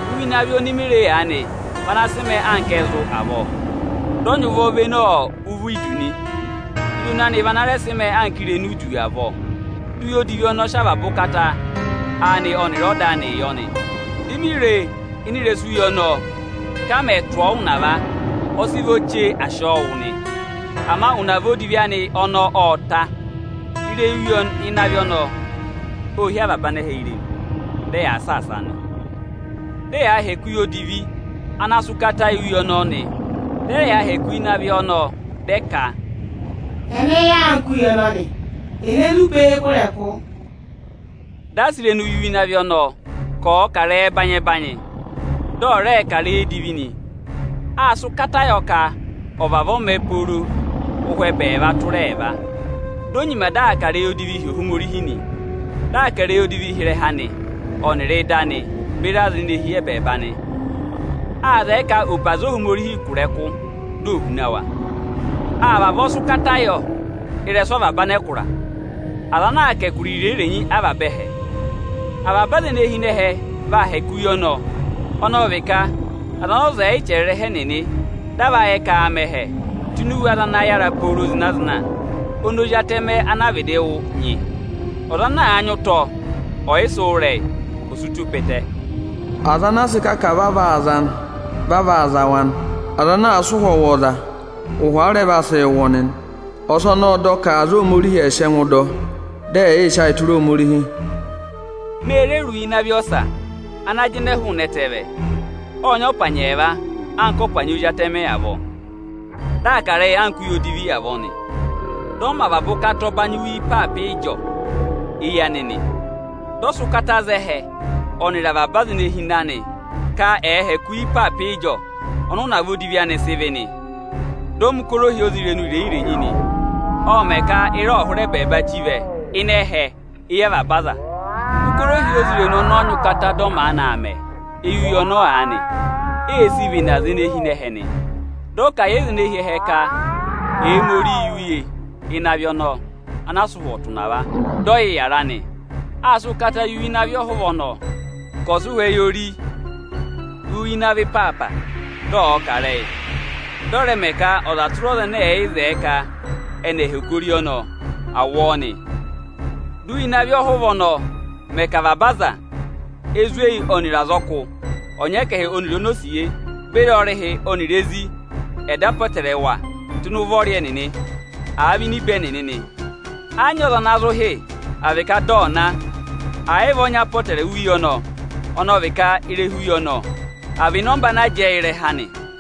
Uye ịnị avị oni mi re aanị vị ana sị mẹẹ anka ẹzụ avọọ. Dị ọ nyị ụvọ vene ụvọ idu nị. Irenu anị vị ana rẹ sị mẹẹ irenu idu avọọ Di uye odivi ọnọọ sị avaba ụkata anịị yọ nị. Di mi re ịnị ịrẹsụ uye ọnọọ ka a mẹ̀ tụ̀ ọọ ụnava, ọ sị vọ chee à sị ọọ wụ nị. Ama ụnava odivi anị ọnọọ ọ́ọ ta. Ịrẹyị uye ịnị avị ọnọọ óo hí avaba anẹhẹ irenu, dị ẹyaa saasaa nị. Dị ẹyaa hẹkẹ uye odivi ana sị ụkata yị uye ọnọọ nị. Dị ẹ rẹ yaa hẹkẹ uye ịnị avị ọnọọ, dị ẹ ka, “Ẹnẹ yà anka uye ọnọnị? Ene zụ pee kụ̀ ịrẹkụ?” Dị a sị irenu yị uye ịnị avị ọnọọ ka ọ̀ọ kà ịrẹyị ẹbanyị-ẹbanyị, dị ọ̀ rẹẹ kà ịrẹyị edivi nị. Áa sị ụkata yọ ka ọ̀ vavọọ mẹ pooro mẹ ụhwẹ ẹbẹẹva tụra ẹẹva. Di o nyima dị aa kà ịrẹyị odivii hi Ohomorihi nị, dị aa kà ịrẹyị odivii hi ịrẹha anị ọnịrị ịda anị beri aza ene hi ẹbẹẹba nị. Áa zẹẹ ka ò pe aza Ohomorihi kụ̀ ịrẹkụ, di ò huna wa. A vavọọ sị ụkata yọ ịrẹsụ avaba anẹkụra, aza ana aa kà ẹkụra irenyi-irenyi avaba ẹhẹ. Avaba aza ene hi ịnị ẹhẹ vaa hẹkẹ uye ọnọọ; ọnọọ vị ka aza ọnị ọza ọ̀ yị chẹrẹ ịrẹha ẹnịnị dị a va yẹ ka aa mẹ ẹhẹ tụ́ ini iwe aza ana yàra pooro zịna-zịna oni Ozi Atẹmẹ anaa vịdị wụ nyị. Ọza ana àa nyị ụtọ ọyịsị wụ́ ịrẹyị, ọ̀ sị ụtọ pe ẹtẹ. Aza ana àa sị kà ka vaa vaa za nị, vị a vaa za wa nị. Aza ana àa sị ụ̀hwọ̀ wụ̀ ọza, ụhwọ a rẹ vaa sị wụ ọnị nị. Ọsọnị ọ́ọ dọ ka aza Ohomorihi ẹ̀ sị ẹngụ dọ ọ, dị ẹ̀ yị sị ayị tụra Ohomorihi. Me re re uye ịnị avị ọsa ana aa jịnẹẹ hụụnị ẹtẹẹ vẹ. Ọ́ọ nyị ọpanyị ẹẹva anka ọpanyị ozi atẹmẹ avọọ. Dị aa kà ịrẹyị anka uye odivi avọọ nị. Dị ọ mẹ avaba ụkata ọbanyị uye ịpaapa ịjọọ éyi anị nị. Dị ọ sị ụkata za ẹhẹ ọnịrị avaba aza ene hi ịnị anị ka ẹ̀ẹ hẹkẹ uye ịpaapa ịjọọ ọnị ụnava odivi anị sị vị́ nị. Dị ọ mẹ̀ ụkọrọ ohyozirenu irenyi-irenyi nị. Ọ́ọ mẹ ka ịra ọ̀ hụrẹ ẹbẹẹba chí vẹ ịnị ẹhẹ éyi avaba aza. Ụkọrọ ohyozirenu ọnọọ nyị ụkata dị ọ maanị aa mẹ éyi uye ọnọọ aanị, ee sii vene aza ene hi ịnị ẹhẹ nị. Dị ọ kà a yị aza ene hi ẹhẹ ka ẹ̀ mẹ ori yị uye ịnị avị ọnọọ anaa sị ụhwọ tụ̀ ụnava, dị ọ yị yàra nị. Áa sị ụkata yị uye ịnị avị ọhụva ọnọọ ka ọ̀ sị ụhwẹ yị ori uye ịnị avị ịpaapa, dị ọ̀ọ kà ịrẹyị; dị ọ̀ rẹ mẹ ka ọza tụra ọza ẹnẹ ẹ̀yị zẹẹ ka ẹnị ẹ̀ hẹkẹ ori ọnọọ, à wụ ọọ nị. Dị uye ịnị avị ọhụva ọnọọ mẹ ka avaba aza, ezweyi ọnịrị azọkụ, ọnyẹkẹhị ọnịrị onosiye beri ọrịhị ọnịrị ezi ẹ̀ dọ apọtẹrẹwa tụ́ ịnị ụvọrị ẹnịnị, àa vị ini ibe ẹnịnị nị. Ẹ yị nyị ọza ana zụ hị́, à vị ka dị ọ̀ ná, ẹ̀ yị vị ọ nyị apọtẹrẹwa uye ọnọọ, ọnọọ vị ka ịrẹha uye ọnọọ, àa vị ịnọmba ana jẹẹ yị ịrẹha anị.